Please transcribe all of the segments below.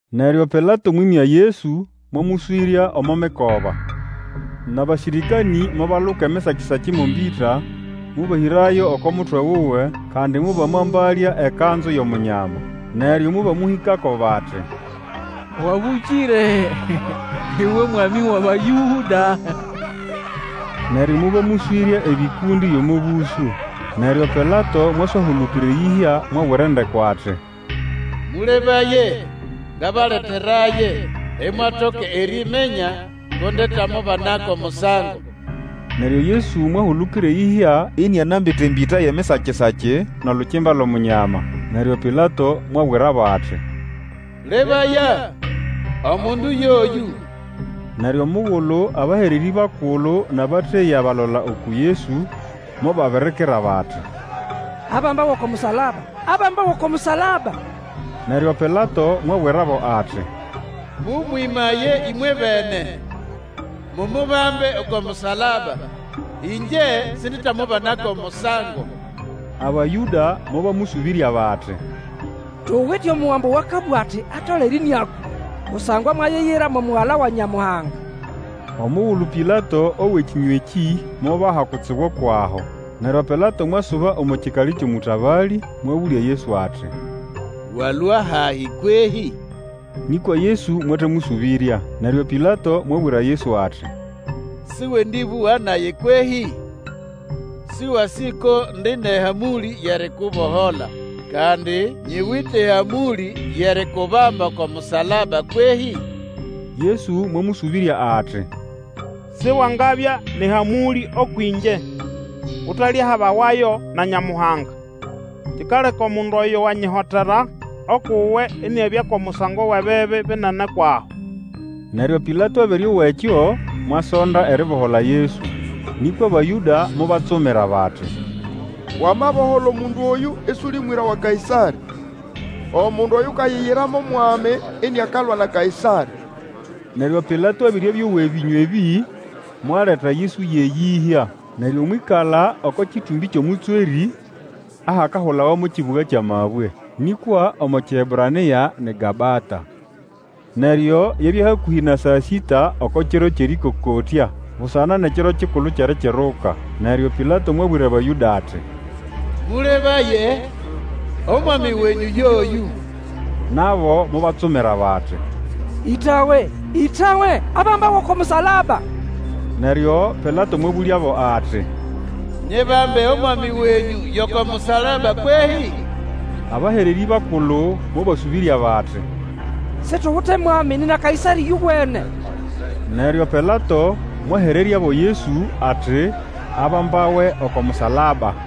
Neryo Pilato mwĩmya Yesu mwamũswĩrya omo mikoba. Nʼabasĩrĩkanĩ mobaluka emisaki-saki mo mbĩta, mobahĩrayo oko mutwe wuwe, kandi mobamwambalya ekanzu yʼOmunyama. Neryo mobamũhĩkako bati, Wabũkĩre uwe Mwami wʼAbayũda! Neryo mobamũswĩrya ebĩkũndĩ byʼomo bũsũ. Neryo Pilato mwaswahulukira eyĩhya, mwabwira endeko ati, Mũlebaye, ngabaleteraye, imwatoka eriminya ko ndetamubana ko musango. Neryo Yesu mwahulukira eyĩhya, inianambite embĩta yʼemisakisaki, nʼolukimba lʼomunyama. Neryo Pilato mwabwirabo ati, Lebaya! Omundu yoyũ! Neryo omugulu abahererĩ bakulu nʼabateya balola uku Yesu mobabirikira bati, Abambawe oko musalaba! Abambawe oko musalaba! Neryo Pilato mwabwirabo ati, Mũmwĩmaye ĩmwebene, mumubambe oko musalaba, Ĩngye sinditamubana ko musango. Abayũda mobamũsũbĩrya bati, Tuwite omugambo owakabũga ati atolere ĩnĩakwa, kusangwa mwayiyira mo Mugala wa Nyamuhanga. Omugulu Pilato owa ekĩnywa ekĩ mubaha kutsibu kwʼaho. Neryo Pilato mwasuba omo kikali kyʼomũtabalĩ, mwabũlya Yesu ati, Walũa hahi kwehĩ? Nĩkwa Yesu mwatamũsũbĩrya. Neryo Pilato mwabwira Yesu ati, Sĩwendĩbũga nage kwehĩ? Sĩwasĩ ko ndi nʼehamũlĩ yʼerikubohola, kandi nyiwite ehamũlĩ yʼerikubamba oko musalaba kwehĩ? Yesu mwamũsũbĩrya ati, Siwangabya nʼehamũlĩ ũkwʼĩngye utalyahabawayo na Nyamuhanga. Kikaleka omundu oyo wanyihotera ukʼuwe iniabya ko musango wʼebibi binene kwʼaho. Neryo Pilato abere owa ekyo, mwasonda eribohola Yesu. Nĩkwa Abayũda mobatsumira bati, Wamabohola omundu oyũ isuli mwĩra wa Kaĩsarĩ! Omundu oyukayiyira mo mwami iniakalwa na Kaĩsarĩ! Neryo Pilato abere abĩowa ebĩnywa ebĩ, mwaleta Yesu yʼeyĩhya, neryo mwĩkala oko kĩtũmbĩ kyʼomũtswerĩ, ahakahulawa mo Kibuga kyʼAmabwe, nĩkwa omo Kĩebranĩa ni Gabata. Neryo yabya hakũhĩ na saa sĩta oko kiro kyʼerĩkokotya busana nʼEkiro Kikulu kyʼErikiruka. Neryo Pilato mwabwira Abayũda ati, Mũlebaye, omwami wenyũ oyũ! Nabo mobatsumira bati, Ĩtawe! Ĩtawe! Abambawe oko musalaba! Neryo Pilato mwabũlyabo ati, Nyibambe omwami wenyũ yʼoko musalaba kwehĩ? Abahererĩ bakulu mobasũbĩrya bati, Situwite mwami nina Kaĩsarĩ ĩyowene. Neryo Pilato mwahereryabo Yesu ati abambawe oko musalaba.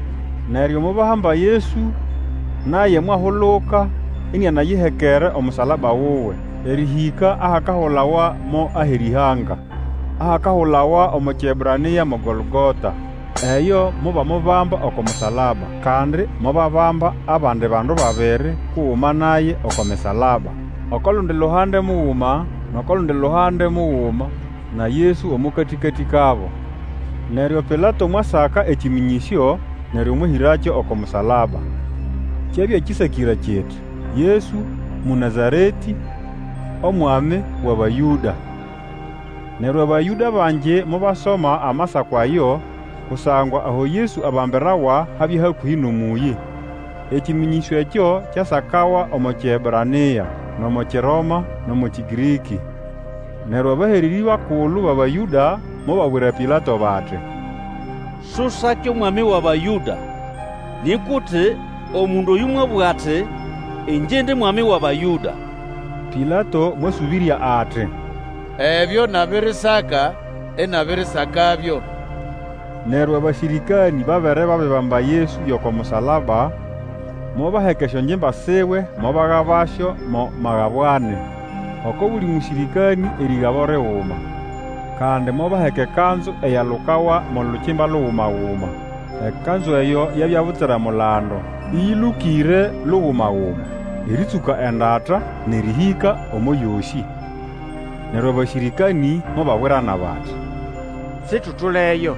Neryo mobahamba Yesu, naye mwahuluka, inianayihekere omusalaba wuwe, erĩhĩka ahakahulawa mo Aherĩhanga, ahakahulawa omo Kiebranĩa mo Golgota. Eyo mobamubamba oko musalaba. Kandi mobabamba abandi bandu babiri kuguma naye oko misalaba, oko lundi luhande muguma, nʼoko lundi luhande muguma, na Yesu omo katĩkatĩ kabo. Neryo Pilato mwasaka ekĩmĩnyĩsyo, neryo mwahĩrakyo oko musalaba. Kyabya kĩsakĩre kiti, YESU Mũnazaretĩ, omwami wʼAbayũda. Neryo Abayũda bangi mobasoma amasako ayo, kusangwa aho Yesu abambirawa habya hakũhĩ nʼomũyĩ. Ekĩmĩnyĩsyo ekyo kyasakawa omo Kiebranĩa, nʼomo Kiroma, nʼomo Kĩgĩrĩkĩ. Neryo abahererĩ bakulu bʼAbayũda mobabwira Pilato bati, Susake Omwami wʼAbayũda, nĩkwa uti, Omundu oyũ mwabũga ati, Ĩngye indi mwami wʼAbayũda. Pilato mwasũbĩrya ati, Ebyo nabirisaka, inabirisakabyo. Neryo abasĩrĩkanĩ babere babibamba Yesu yʼoko musalaba, mobaheka esyongimba siwe mobagabasyo mo magabo ani, oko buli mũsĩrĩkanĩ erĩgabo liguma. Kandi mobaheka ekanzu eyalukawa mo lukimba luguma-guma. Ekanzu eyo yabya butsira mulando, ĩyĩlũkĩre luguma-guma erĩtsũka endata nʼerĩhĩka omo yosĩ. Neryo abasĩrĩkanĩ mobabwirana bati, Situtuleyo,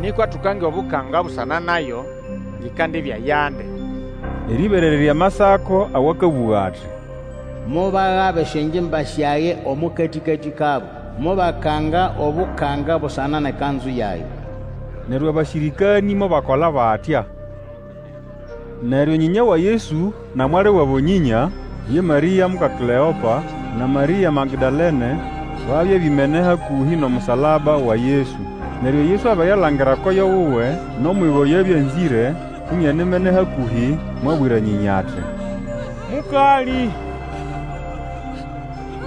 nĩkwa tukange obukanga busana nayo ngʼikandibya yandi, erĩberererya Amasako awakabũga ati, Mobagaba esyongimba syage omo katĩkatĩ kabo, Mobakanga obukanga busana nʼekanzu yage. Neryo abasĩrĩkanĩ mobakola batya. Neryo nyĩnya wa Yesu, na mwali wabo nyĩnya, ye Marĩa muka Kleopa, na Marĩa Magdalene, babya bimene hakũhĩ nʼomusalaba wa Yesu. Neryo Yesu abere alangira koyo wuwe nʼomwiga oyo abya anzĩre, inianimene kahũhĩ, mwabwira nyĩnya ati, Mũkalĩ,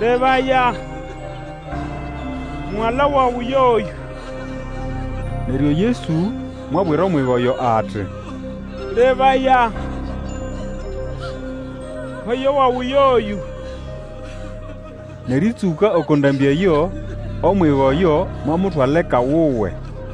lebaya, mugala wawe yoyũ! Neryo Yesu mwabwira omwiga oyo ati, Lebaya, koyo wawe yoyũ! Nʼerĩtsũka oko ndambĩ eyo omwiga oyo mwamutwala eka wuwe.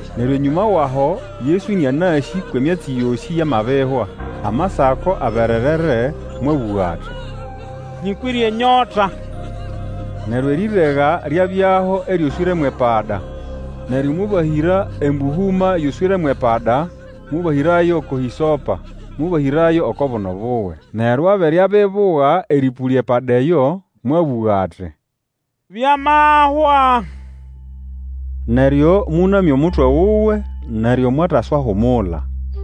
Neryo enyũma wʼaho Yesu ĩnĩanasĩ kwʼemyatsi yosĩ yamabihwa, Amasako abererere, mwabũga ati, Nyĩkwĩre enyota. Neryo erĩrega lyabyaho eryoswĩre mwʼepada. Neryo mobahĩra embũhũma yoswĩre mwʼepada, mobahĩrayo oko hĩsopa, mobahĩrayo oko buno buwe. Neryo abere abibuga erĩpũlya epada eyo, mwabũga ati, Byamahwa. Neryo mũnamya omutwe wuwe neryo mwataswahumula.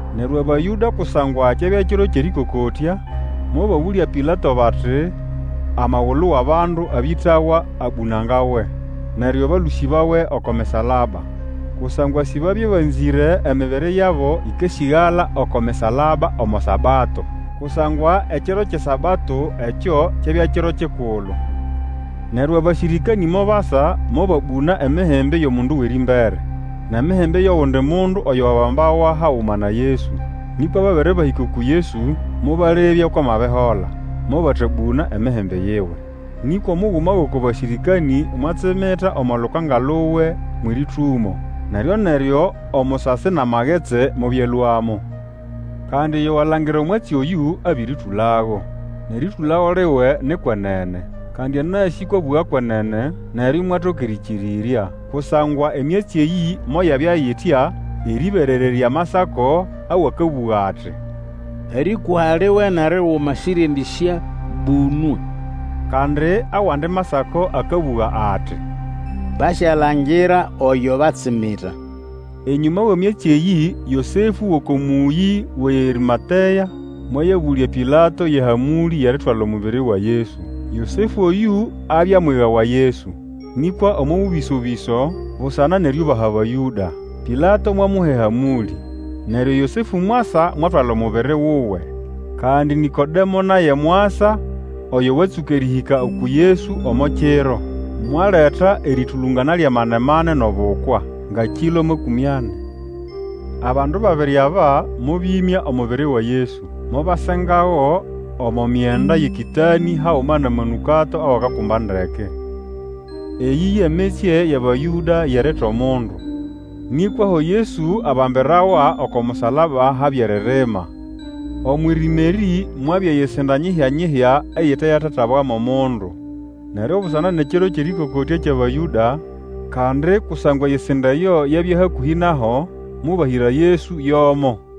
Neryo Abayũda kusangwa kyabya Kiro kyʼErĩkokotya, mobabũlya Pilato bati amagulu wʼabandu abĩtawa abũnangawe, neryo balũsĩbawe oko misalaba. Kusangwa sibabya banzĩre emibiri yabo ĩkasĩgala oko misalaba omo Sabato, kusangwa ekiro kyʼeSabato ekyo kyabya kiro kikulu. Neryo abasĩrĩkanĩ mobasa, mobabũna emihimbi yʼomundu wʼerĩmbere, nʼemihimbi yʼogundi mundu oyo wabambawa haguma na Yesu. Nĩkwa babere bahĩka uku Yesu, mobalebya kwʼamabihola, mobatabũna emihimbi yiwe. Nĩkwa omuguma gʼoko basĩrĩkanĩ mwatsimita omo lukanga luwe mwʼerĩtũmo, neryo-neryo omusasi nʼamagetsi mobyalũamo. Kandi oyo walangira omwatsi oyũ abĩrĩtũlago, nʼerĩtũlago liwe ni kwenene. Kandi anasĩ kwʼakabũga kwenene, neryo imwatoka erĩkĩrĩrya. Kusangwa emyatsi eyĩ moyabya itya, erĩberererya Amasako awakabũga ati, Erĩkũha liwe nʼeriguma sĩryendĩsyabũnwa. Kandi awandi Masako akabũga ati, Basyalangira oyo batsimita. Enyũma wʼemyatsi eyĩ Yosefũ wʼoko mũyĩ wʼeArĩmatea mwayabũlya Pilato yʼehamũlĩ yʼeritwala omubiri wa Yesu. Yosefũ oyũ abya mwiga wa Yesu, nĩkwa omo bũbĩso-bĩso, busana nʼeriubaha Abayũda. Pilato mwamuha ehamũlĩ, neryo Yosefũ mwasa mwatwala omubiri wuwe. Kandi Nĩkodemo naye mwasa oyo watsũka erĩhĩka uku Yesu omo kiro, mwaleta erĩtũlũngana lyʼamane-mane nʼobukwa, nga kĩlo makũmĩ ani. Abandu babiri aba mobĩmya omubiri wa Yesu, mobasengago omo myenda yʼekĩtanĩ haguma nʼamanũkato awakakumba ndeke. Eyĩ ye mitsye yʼAbayũda yʼerita omundu. Nĩkwa aho Yesu abambirawa oko musalaba habya eririma. Omwʼirima erĩ mwabya eyisinda nyihya-nyihya, eyite yatatabwa mo mundu. Neryo busana nʼeKiro kyʼErĩkokotya kyʼAbayũda, kandi kusangwa eyisinda eyo yabya hakũhĩ naho, mobahĩra Yesu yʼomo.